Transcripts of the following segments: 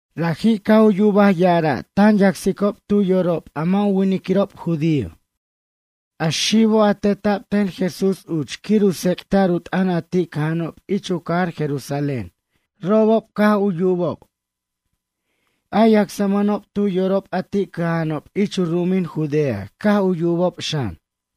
Raji' caj u yubaj ya'ara' tan yacsicob tu yorob a mʌ' u winiquirob judío. A xibo', a teta'b ten Jesús uch quir u tsec'ta'r u t'ʌn a ti' cʌja'anob ich u cajar Jerusalén, robob caj u yubob. A yacsmʌnob tu yorob a ti' cʌja'anob ich u ru'umin Judea caj u yubob xan.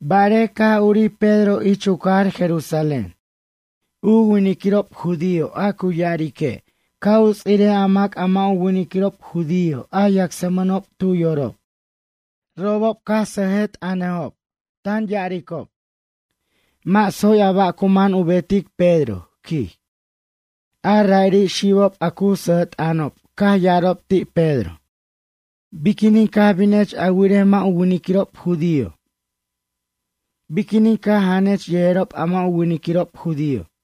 Barej, caj urij Pedro ich u cajar Jerusalén. U winiquirob judío a cu ya'arique', ca' u ts'irej mac a mʌ' u winiquirob judío, yacsmʌnob tu yorob. Robob caj u sʌjʌt'ʌnob, tan ya'aricob: “Mʌ' tsoy a ba' cu man u betic Pedro, quij.” A ra'iri' xibob a cu sʌjʌt'ʌnob, caj ya'arajob ti' Pedro: ―Biquinin caj binech a wirej mʌ' u winiquirob judío? Biquinin caj janech yejerob a mʌ' u winiquirob judío?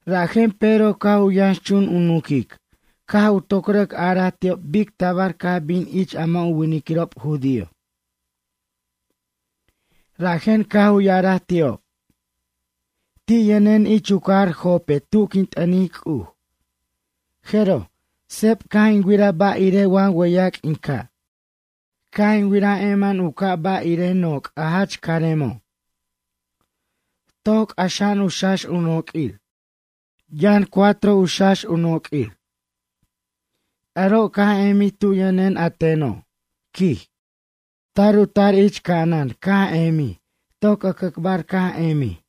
Rajen Pedro caj u yʌnxchun u nunquic, caj u toc rʌc araj ti'ob bic tabar caj bin ich a mʌ' u winiquirob judío. Rajen caj u ya'araj ti'ob; ―Ti' yʌnen ich u cajar Jope tu quin t'ʌnic C'uj, jeroj, seb caj in wiraj ba' irej wa wʌyac' in ca'. Caj in wiraj emen u ca' ba' irej noc' a jach caremo'. Toc c'axa'an u xax u noq'uir. Yʌn cuatro u xax u noq'uir. Aro' caj emij tu yʌnen a teno' ―quij―. Tar u tar ich ca'anan caj emij toc ʌcʌcbar caj emij.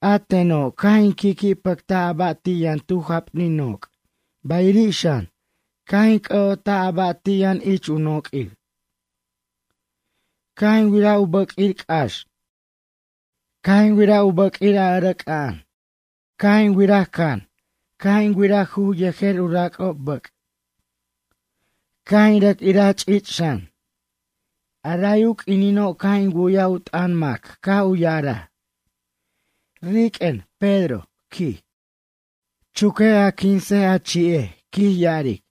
A teno', caj in qui'qui' pʌctaj a ba' ti' yʌn tu japnin noc', bayiri' xan, caj in c'ʌ'otaj a ba' ti' yʌn ich u noq'uir. Caj in wiraj u bʌq'uir c'ax. Caj in wiraj u bʌq'ir a ʌrʌc'a'an. Caj in wiraj can, caj in wiraj juj yejer u rac'ob bʌc'. Caj in rʌc iraj ch'ich' xan. A ray a q'uinino' caj in wu'yaj u t'ʌn mac caj u ya'araj: “Riq'uen, Pedro, quij. Chuquej a quinsej, a ch'i'ej, quij ya'aric.”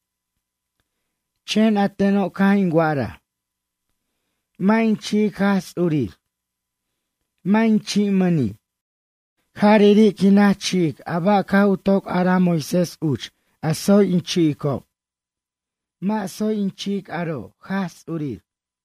Chen a teno', caj in wa'araj: “Mʌ' in chi'ic Jaj Ts'urir. Mʌ' in chi'mʌni'. Jariri' quin naj chi'ic a ba' caj u toc araj Moisés uch, a tsoy in chi'icob. Mʌ' tsoy in ch'i'ic aro', Jaj Ts'urir.”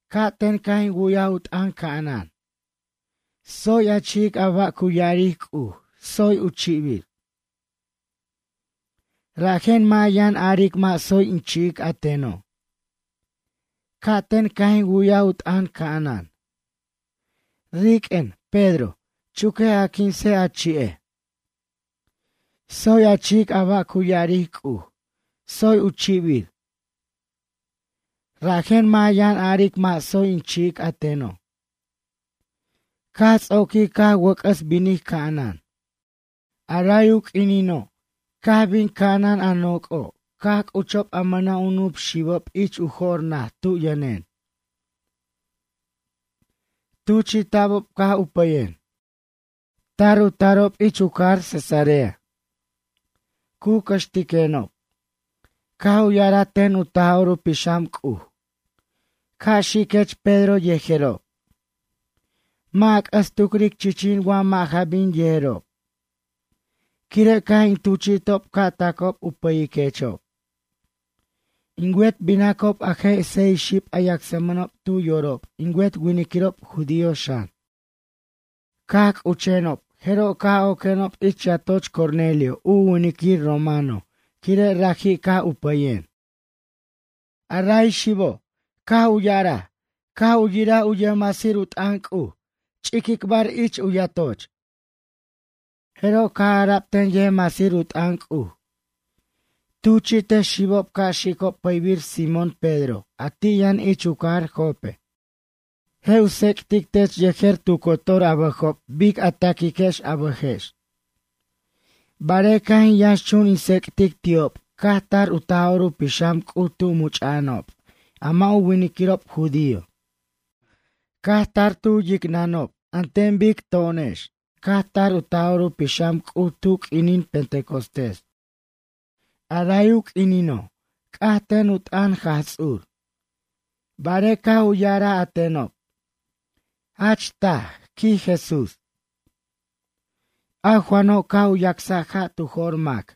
Ca'ten caj in wu'y u t'ʌn ca'anan: “Tsoy a chi'ic a ba' cu ya'aric C'uj, tsoy u chibir. Rajen mʌ' a yan aric mʌ' tsoy in chi'ic a teno'.” Ca'ten caj in wu'yaj u t'ʌn ca'anan: “Riq'uen, Pedro. Chuquej a quinsej, a chi'ej. Tsoy a chi'ic a ba' cu ya'aric C'uj, tsoy u chibir. Rajen mʌ' a yʌn aric mʌ' tsoy in chi'ic a teno'.” Caj ts'oquij caj wʌc'ʌs binij ca'anan. A ray u q'uinino', caj bin ca'anan a noc'o', caj c'uchob a mʌna' u nup xibob ich u jor naj tu yʌnen. Tuchi'ta'bob caj u pʌyen. Tar u tarob ich u cajar Cesarea. Cu cʌxtiquenob. Caj u ya'araj ten u Taj'or u Pixam C'uj: “Ca' xiquech Pedro yejerob. Mʌ' a c'ʌs tucric chichin wa mʌ' ja bin yejerob. Quire' caj in tuch'itob ca' tacob u pʌyiquechob.” In wet binacob a je' seis xib a yacsʌmʌnob tu yorob, in wet winiquirob judío xan. Caj c'uchenob jeroj caj oquenob ich yatoch Cornelio u winiquir romano, quire' raji' caj u pʌyen. A ray xibo' caj u ya'araj caj u yiraj u yʌjmasir u t'ʌn C'uj ich u yatoch ch'iquicbar. Jeroj caj ara'b ten yʌjmasir u t'ʌn C'uj: “Tuchi'tej xibob ca' xicob pʌybir Simón Pedro a ti' yʌn ich u cajar Jope. Je' u tsec'tic tech yejer tu cotor a bʌjob bic a taquicquex a bʌjex.” Barej caj in yʌnxchun in tsec'tic ti'ob caj tar u Taj'or u Pixam C'uj tu much'a'anob a mʌ' u winiquirob judío. Caj tar tu yicnʌnob an ten bic to'onex caj tar u Taj'or u Pixam C'uj tu q'uininin Pentecostés. A ray u q'uinino', c'aj ten u t'ʌn Jaj Ts'ur barej caj u ya'araj a tenob: “Jach taj, quij Jesús. A Juano' caj u yacsaj ja' tu jo'r mac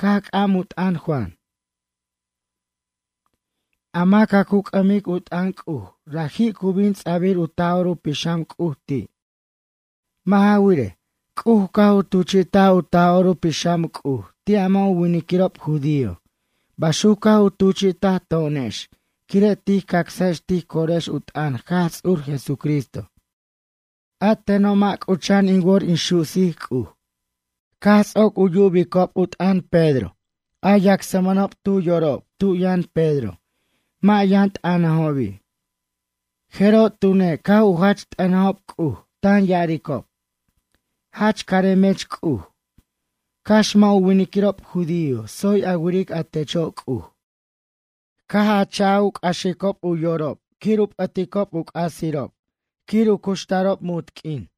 caj c'am u t'ʌn Juan. A mac a cu c'ʌmic u t'ʌn C'uj, raji' cu bin ts'a'bir u Taj'or u Pixam C'uj ti'.” Mʌ' ja wirej, C'uj caj u tuchi'taj u Taj'or u Pixam C'uj ti' a mʌ' u winiquirob judío, baxuc caj u tuchi'taj to'onex quire' tij cacsajex tij corex u t'ʌn Jaj Ts'ur Jesucristo. A teno' mʌ' c'ucha'an in wor in su'sic C'uj. Caj ts'oc u yubicob u t'ʌn Pedro a yacsmʌnob tu yorob tu yʌn Pedro mʌ' yʌn t'ʌnajobi', jeroj tune' caj u jach t'ʌnajob C'uj, tan ya'aricob: ―Jach caremech C'uj. Cax mʌ' u winiquirob judío tsoy a wiric a techo' C'uj. Caj a cha' u c'axob u yorob quir u p'ʌticob u c'asirob quir u cuxtarob munt q'uin.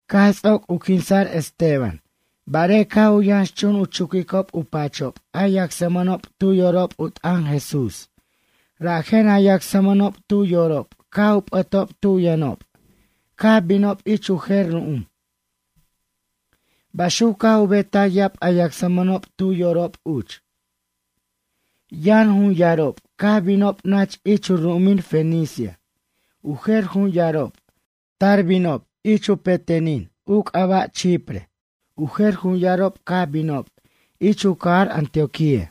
Caj ts'oc u quinsa'r Esteban, barej caj u yʌnxchun u chuquicob u pachob a yacsmʌnob tu yorob u t'ʌn Jesús rajen a yacsmʌnob tu yorob caj u p'ʌtob tu yʌnob caj binob ich u jer ru'um, baxuc caj u betaj ya'ab a yacsmʌnob tu yorob uch. Yʌn jun yarob, caj binob nach ich u ru'umin Fenicia, u jer jun yarob, tar binob ich u petenin u c'aba' Chipre, u jer jun yarob caj binob ich u cajar Antioquía.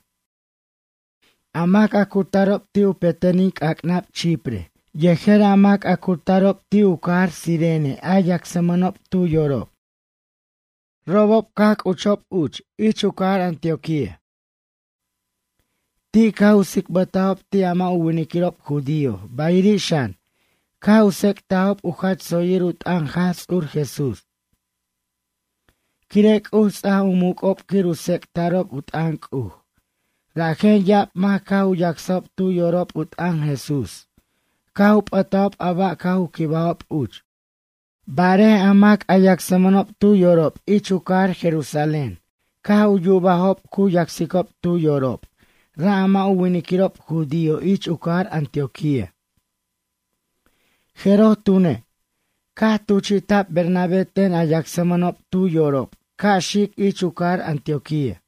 A mac a cu tarob ti' u petenin c'ac'nab Chipre yejer a mac a cu tarob ti' u cajar Cirene, a yacsmʌnob tu yorob. Robob caj c'uchob uch ich u cajar Antioquía. Ti' caj u tsicbʌtajob ti' a mʌ' u winiquirob judío, bayiri' xan, caj u tsec'tajob u jach tsoyir u t'ʌn Jaj Ts'ur Jesús. Quire' C'uj ts'aj u muc'ob quir u tsec'ta'rob u t'ʌn C'uj, rajen ya'ab mac caj u yacsajob tu yorob u t'ʌn Jesús caj u p'ʌtajob a ba' caj u quibajob uch. Barej a mac a yacsmʌnob tu yorob ich u cajar Jerusalén caj u yubajob cu yacsicob tu yorob ra' a mʌ' u winiquirob judío ich u cajar Antioquía, jeroj tune', caj tuchi'ta'b Bernabé ten a yacsmʌnob tu yorob ca' xic ich u cajar Antioquía.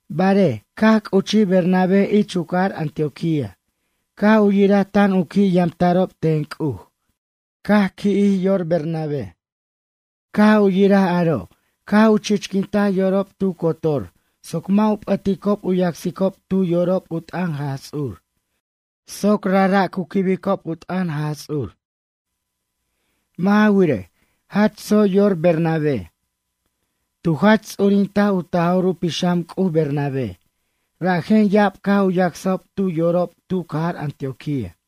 Barej, caj c'uchij Bernabé ich u cajar Antioquía, caj u yiraj tan u qui' yamta'rob ten C'uj, caj qui'jij yor Bernabé. Caj u yiraj aro', caj u chichquintaj yorob tu cotor soc mʌ' u p'ʌticob u yacsicob tu yorob u t'ʌn Jaj Ts'ur, soc u rajra' cu quibicob u t'ʌn Jaj Ts'ur. Mʌ' ja wirej, jach tsoy yor Bernabé. Tu jachts'urinta' u Taj'or u Pixam C'uj Bernabé, rajen ya'ab caj u yacsajob tu yorob tu cajar Antioquía.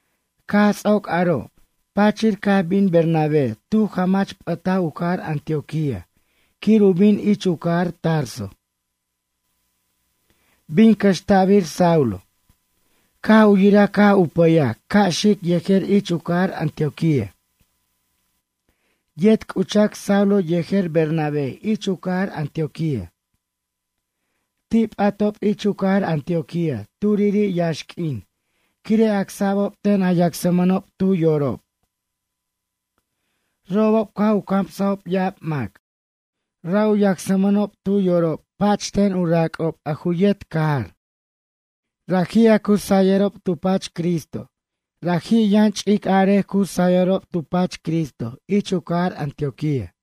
Caj ts'oc aro', pachir caj bin Bernabé, tu jamach p'ʌtaj u cajar Antioquía quir u bin ich u cajar Tarso. Bin cʌxta'bir Saulo. Caj u yiraj caj u pʌyaj ca' xic yejer ich u cajar Antioquía. Yet c'uchac Saulo yejer Bernabé ich u cajar Antioquía. Ti' p'atob ich u cajar Antioquía turiri' yaxq'uin quire' acsa'bob ten a yacsmʌnob tu yorob. Robob caj u camsajob ya'ab mac. Ra' u yacsmʌnob tu yorob pa'ch ten u rac'ob, a ju yet cajar: Raji' a cu sayʌrob tu pach Cristo, 'raji' yʌn ch'ic arej cu sayʌrob tu pach Cristo ich u cajar Antioquía.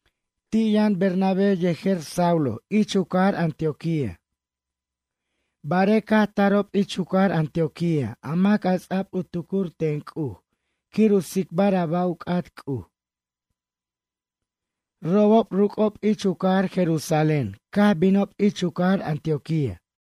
Ti' yʌn Bernabé yejer Saulo ich u cajar Antioquía barej caj tarob ich u cajar Antioquía a mac a ts'ab u tucur ten C'uj quir u tsicbar a ba' u c'at C'uj. Robob ruc'ob ich u cajar Jerusalén caj binob ich u cajar Antioquía.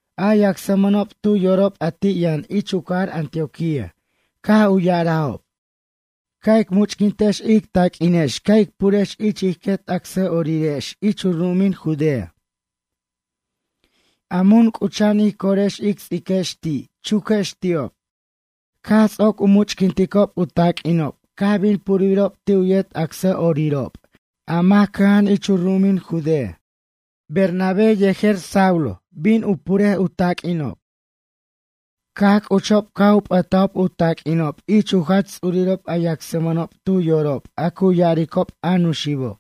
A yacsmʌnob tu yorob a ti' yʌn ich u cajar Antioquía caj u ya'arajob: ―Ca' ic much'quintex ic taq'uinex ca' ic purex ich ij quet acsa'orirex ich u ru'umin Judea. A mun c'ucha'an ij corex ic ts'iquex ti', chuquex ti'ob. Caj ts'oc u much'quinticob u taq'uinob caj bin purbirob ti' u yet acsa'orirob a mac cʌja'an ich u ru'umin Judea. Bernabé yejer Saulo bin u puric u taq'uinob. Caj c'uchob caj u p'ʌtajob u taq'uinob ich u jach ts'urirob a yacsmʌnob tu yorob a cu ya'aricob a Nuxibo'.